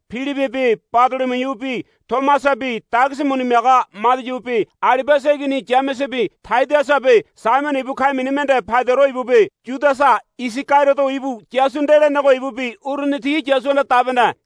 Pilibibi Badolomiubi Tomasabi dagisi muni miaga Madiubi Alibiasa igini Yamesebi Tadiasabi Saimono ibu ka̱i̱ mini mende Paidoro ibubi Yudasa Isagariodo ibu Yasu nde lenego ibubi uruni ti Yasuhanda dabene.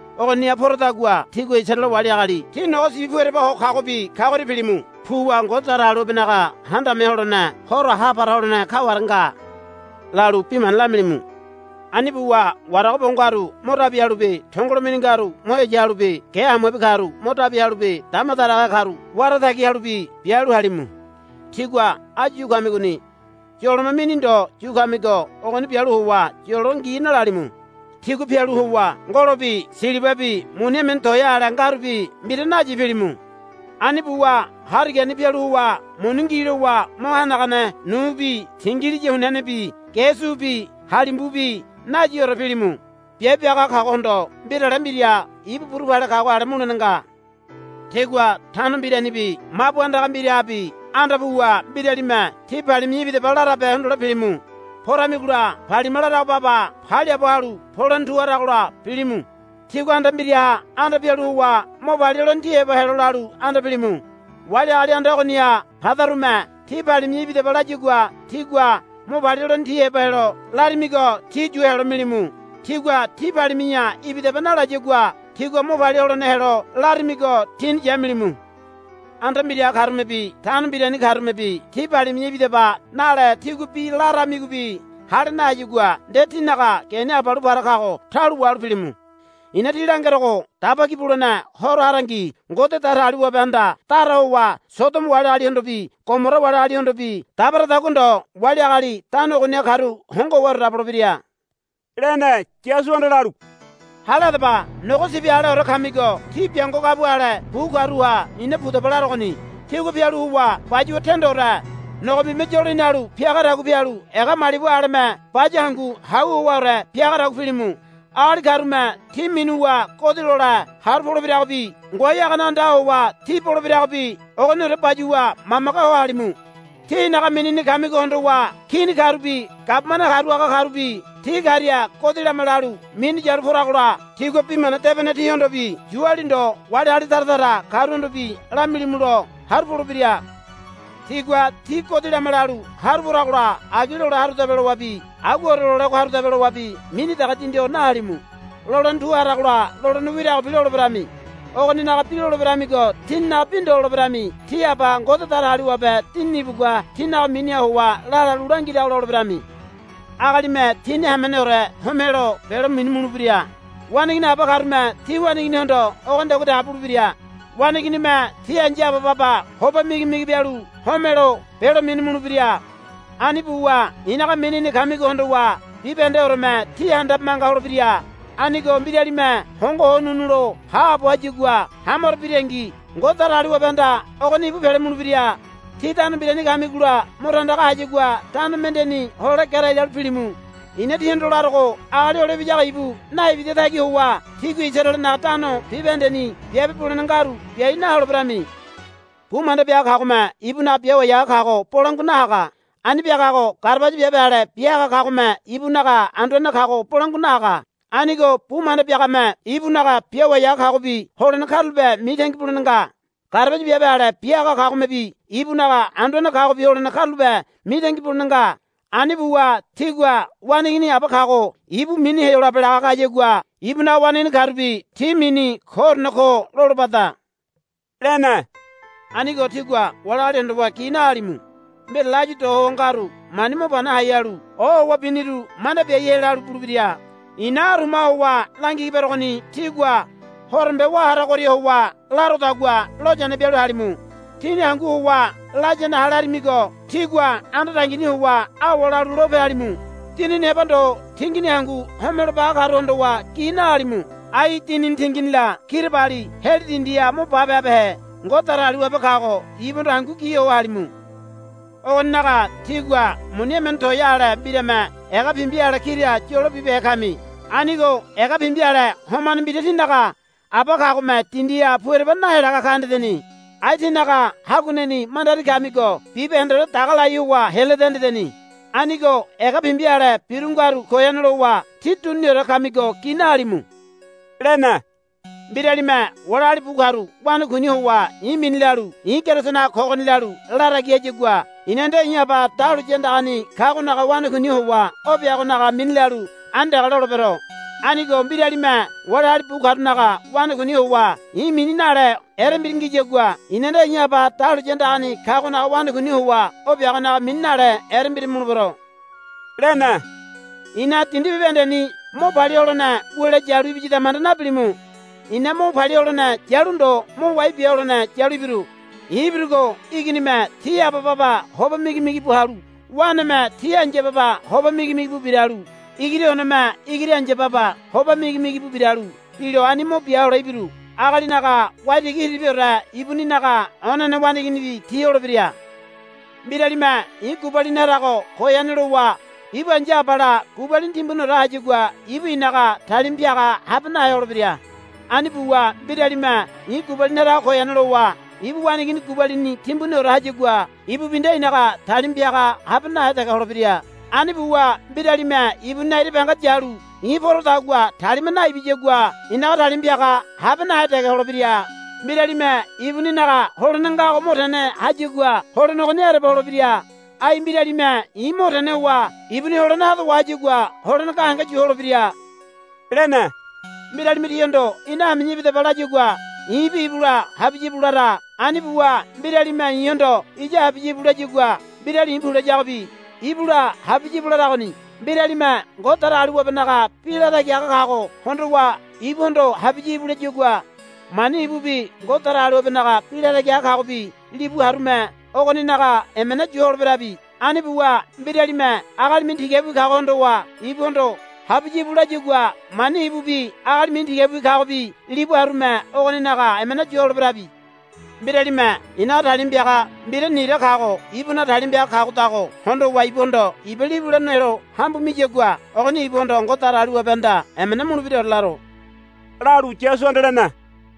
Ogoniha poradagua tígua Isaraele wali agali ti nogo sibi pu ereba ho kagobi kagoria pilimu. Puwa, Ngode Datagaliwabenaga Handame Ho Holene horo ha para holene kaware nga, lalu bi mana lamilimu. Ani buwa warago bo ngaru mo dabi halubi tongolo mini ngaru mo heya halubi ge hamuabi karu mo dabi halubi dama daragahe karu wara tagi halubi bialu halimu. Tígua áyu yu kamigoni yolome mini ndo yu kamigo ogoni bialu howa yolo ngi nalalimu. Tígua pialu howa ngolobi silibabi muni emene toea ale ngarubi mbira nayi pilimu. Ani buwa harigani pialu howa muni ngi lowa mo hanagane nubi tingiliya hunianebi ge subi halimbubi nayiore pilimu. Biabe biaga kagohondo mbirale mbira ibu buru pale kago ale mulene nga. Tígua tano mbiranibi mabu andaga mbirahabi anda puwa mbiralime, Tí palimi̱ya ibidaba, larabe hondole pilimu. Poramigola palima larago baba paliaabo halu polene tu haragola pilimu. Tígua anda mbiraha anda pialu howa, Mo palia holene tí heba helo, lalu anda pilimu. Wali agali anda ogoniha padarume, Tí palimi̱ya ibidaba, layagua tígua mo palia holene tí heba helo larimigo ti yu helo milimu. Tigua tí palimi̱ya ibidaba nalayagua tígua mo palia holene helo larimigo tíni yamilimu. Anda mbiraha karumebi tano mbirani karumebi tí palimi̱ya ibidaba nale tígua bi laramigobi hale nahayagua nde tínaga geni abalu para kago taulo wahalu pilimu. I̱na tí langerogo Daba Ki Bulene Horo harangi Ngode Datagaliwabehanda dara howa Sodomo wali agalihondobi Gomora wali agalihondobi dabaradagua ndo wali agali tano ogoniha karu hongo howaore dabolebira, lene. Yasuhanda lalu, Hale hadaba. Nogo sibi aleore kamigo tí biango gabua ale bu karuha i̱na pudaba larogoni. Tígua pialu howa bayuwa tendore nogombime yolo hinalu piagadagua pialu ega malibu aleme baya hangu hau howaore piagadagua pilimu. Agali karume tí minuwa godi lole haru polebiragobi ngoai hagane andaha howa tí bolebiragobi ogoniore bayuwa mamage ho halimu. Tí i̱naga minini kamigo hondowa kini karubi gabumane haru haga karubi ti karia godi lama lalu minu yalu poragola tígua Bi Mana Debene tihondobi Yuali ndo wali agali tara tara karuhondobi lamilimulo haru polebira. Tigua tí godi lama lalu haru poragola agi lole harudabe lowabi aguaore lolego harube lowabi mini dege dindi ho nahalimu. Lolene tu haragola lolene wiragobi loleberami. Ogoninaga bi loleberamigo tíninaga bi ndo loleberami. Tí Aba Ngode Datagaliwabe Dinini ibugua tínaga miniha howa la lalu langirago loleberami. Agalime tini hameneore homelo belo minu mulebira. Waneigini aba karume ti waneiginihondo ogonidagua dege bulebira. Waneiginime ti ai̱ya aba baba hoba migimigi bialu homelo belo minu mulebira. Ani buwa i̱naga minini kamigo hondowa bibahendeoreme tí handabe manga holebira. Anigo mbiralime hongo howa ho ununu lo haabo hayagua hamaro birangi Ngode Datagaliwabehanda ogoni ibu pele mulebira. Tí tano mbirani kamigola mo tandaga hayagua tano mendeni hole gerai lalu pilimu. I̱na tíhondo larogo Agali Hole Ibiyago ibu naibida tagi howa tígua Isaraelenaga tano bibahendeni biabe bulene ngaru biai naholeberami. Bu manda biaga kagome ibunaga biawai haga kago bolangua nahaga. Ani biagago garabaya biabe ale bia haga kagome ibunaga anduane kago bolangua nahaga. Anigo bu manda biagame ibunaga biawai haga kagobi holene karulape mitangi bulene nga. Garabaya biabe ale bia haga kagomebi ibunaga anduane kagobi holene karulape mitangi bulene nga. Ani buwa tigua waneigini aba kago ibu mini Heyolabe laga kayagua ibunaga waneigini karubi ti mini koorene ko lolobada, lene. Anigo tígua wali agali hondowa gi nahalimu. Mbirale áyu do ho ngaru mani mo pani hai halu ohowa biniru manda biaihe lalu bulebira. I̱na arumaha howa langigi berogoni tígua horombe wá haragoria howa larodagua loyane bialu halimu. Tíni hangu howa layane hale harimigo tígua anda dangini howa awa lalu lope halimu. Dinini heba ndo tingini hangu homelo baga karu hondowa gi nahalimu. Ai dinini tinginila kirabali heli dindiha mo bape habehe Ngode Datagaliwabe kago ibuhondo hangu gi ho halimu. Ogoninaga tígua muni emene toea ale mbirame ega pimbi ale kira yolo bibehe kami. Anigo ega pimbi ale homane mbira tínaga Aba kagome dindiha pu ereba henalaga ka hendeni. Ai tínaga haguaneni mandari kamigo bibahendeore daga lai howa heleda hendeni. Anigo ega pimbi ale biru ngaru goyane lowa tí duniniore kamigo gi nahalimu, lene. Mbiralime wali agali bu karu wanakuini howa i̱ mini lalu, I̱ Kerisonaga kogoni, lalu latagi hayagua i̱na nde i̱ Aba dahuliya andagani kagonaga wanakuini howa o biagonaga mini lalu ani dege lolebero. Anigo mbiralime wali agali bu karunaga wanakuini howa i̱ mini nale erembira ngiyagua i̱na nde i̱ Aba dahuliya andagani kagonaga wanakuini howa o biagonaga mini nale erembira mulebero, lene. I̱na dindi bibahendeni mo palia holene wule yalu ibiyada manda nabilimu. I̱na mo palia holene yalu ndo mo wai bia holene yalu ibiru. I̱ ibirugo iginime ti aba baba hoba migi migi bu halu waneme ti ai̱ya baba hoba migi migi bu biralu igiri oneme igiri ai̱ya baba hoba migi migi bu biralu bilo ani mo bia hole ibiru. Agalinaga waitigi hiriribiore ibuninaga onene waneiginibi ti holebira. Mbiralime i̱ gubalini harago goyane lowa ibu ai̱ya abala gubalini timbuniore hayagua ibu i̱naga talima piaga habe nahe holebira. Ani buwa mbiralime i̱ gubalini harago goyane lowa ibu waneigini gubalini timbuniore hayagua ibubi nde i̱naga talima piaga habe nahe dege holebira. Ani buwa mbiralime ibuninaga ira banga yalu i̱ porodagua talima naibiyagua i̱naga talima piaga habe nahe dege holebira. Mbiralime ibuninaga holene ngago mo tene hayagua holene ogoni ereba holebira. Ai mbiralime i̱ mo tene howa ibuni holene hado wahayagua holene gahenge yu holebira, lene. Mbiralime tíhondo, Ina hami̱ya ibidaba, layagua i̱bi ibula habiya i̱bu lara. Ani buwa mbiralime i̱hondo, Iya habiya íbu, layagua mbirali i̱ pu layagobi ibula habiya íbu laragoni. Mbiralime Ngode Datagaliwabenaga bi latagi haga kago hondowa ibuhondo, Habiya íbu, layagua mani ibubi Ngode Datagaliwabenaga bi latagi haga kagobi libu harume ogoninaga emena yu holeberabi. Ani buwa mbiralime agali mini tigabiwi kago hondowa ibuhondo, Habiya íbu, layagua mani ibubi agali mini tigabiwi kagobi libu harume ogoninaga emena yu holeberabi. Mbiralime i̱naga talima piaga mbira nira kago ibunaga talima piaga kagodago hondowa ibuhondo iba libule nelo hambu miyagua ogoni ibuhondo Ngode Datagaliwabehanda emena mulebiraore laro, lalu Yasuhanda lene.